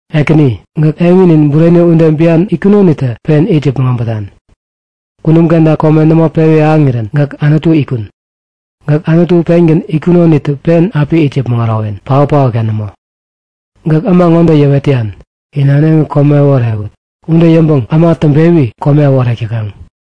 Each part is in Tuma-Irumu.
Ekäni, gäk eŋinin bureni ude bian itkunonitä pen it yäpmäŋ äbätan. Kunum kenta kome nämo pewi ahäŋirän gäk Anutu itkun. Gäk Anutu pengän itkunonitä pen api it yäpmäŋ ärowen. Paotpaotka nämo. Gäk äma ŋode yäwet täyan; In äneŋi kome äworewut. Ude yäŋpäŋ äma täŋpewi kome äworek täkaŋ.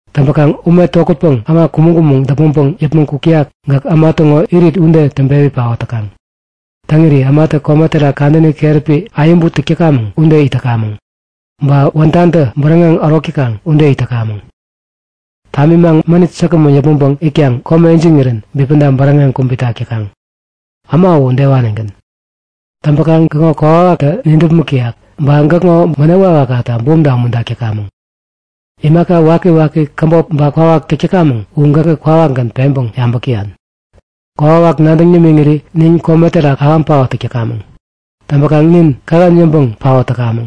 Täŋpäkaŋ ume tokätpäŋ äma kumäŋ-kumäŋ däpmäŋpäŋ yäpmäŋ kuk täyak gäk äma täŋo irit ude täŋpewi paot täkaŋ. Täŋiri ämatä kome terak kadäni keräpi ayäbu täk täkamäŋ ude it täkamäŋ. Ba wädantä bäräŋeŋ ärok täkaŋ ude it täkamäŋ. Tamimaŋ mänit säkgämän yäpmäŋpäŋ itkaŋ kome ijiŋirän bipäda bäräŋeŋ kubitak täkaŋ. Äma uwä udewanigän. Täŋpäkaŋ gäkŋo kokwawaktä nidäpmäk täyak. Ba gäkŋo bänep wakwakta bumta umuntak täkamäŋ. Imaka wakiwaki käbop ba kwawak täk täkamäŋ u gäkä kwawakgän peŋpäŋ yabäk täyan. Kokwawak nadäŋ nimiŋiri nin kome terak ahäŋ paot täk täkamäŋ. Täŋpäkaŋ nin kähän yäŋpäŋ paot täkamäŋ.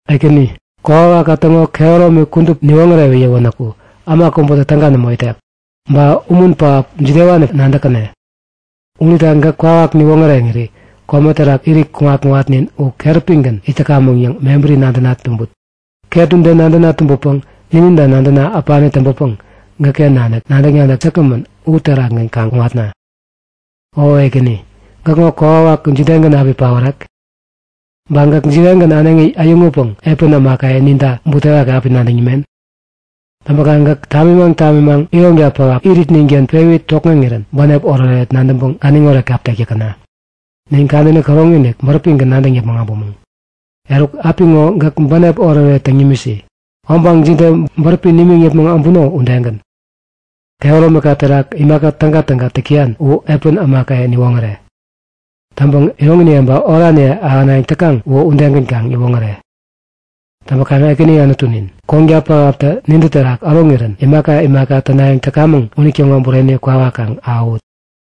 Ekäni, kokwawakka täŋo kehäromi kudup niwoŋärewi yäwänäku äma kubätä täga nämo itek. Ba umun pähap jidewanipäŋ nadäkkäne? Unita gäk kwawak niwoŋäreŋiri kome terak irit kuŋat-kuŋatnin u keräpigän it täkamäŋ yäŋ mebäri nadäna tumbut. Ket ude nadäna tumbäpäŋ nininta nadäna äpani täŋpäpäŋ gäkken nanik nadäk-nadäk säkgämän u terakgän kaŋ kuŋatna. O Ekäni, gäkŋo kokwawak jidegän api paorek? Ba gäk jidegän äneŋi äyäŋutpäŋ epän ämakaye ninta butewaki api nadäŋ nimen? Täŋpäkaŋ gäk tamimaŋ tamimaŋ ironka pähap iritninken pewi tokŋeŋirän bänep oretoret nadäŋpäŋ ganiŋoret kap tek täkäna. Nin kadäni käroŋi-inik bäräpigän nadäŋ yäpmäŋ äbumäŋ. Eruk apiŋo gäk bänep oretoret taŋi nimisi, obaŋ jide bäräpi nimiŋ yäpmäŋ äbuno udegän. Kehäromika terak imaka tägatäga täk täyan u epän ämakaye niwoŋäre. Täŋpäŋ iroŋiniye ba oraniye ahänayäŋ täkaŋ uwä udegän kaŋ yäwoŋäre. Täŋpäkaŋ Ekäni Anutunin, konka pähaptä nintä terak äroŋirän imaka imaka tänayäŋ täkamäŋ unitäŋo bureni kwawak kaŋ ahäwut.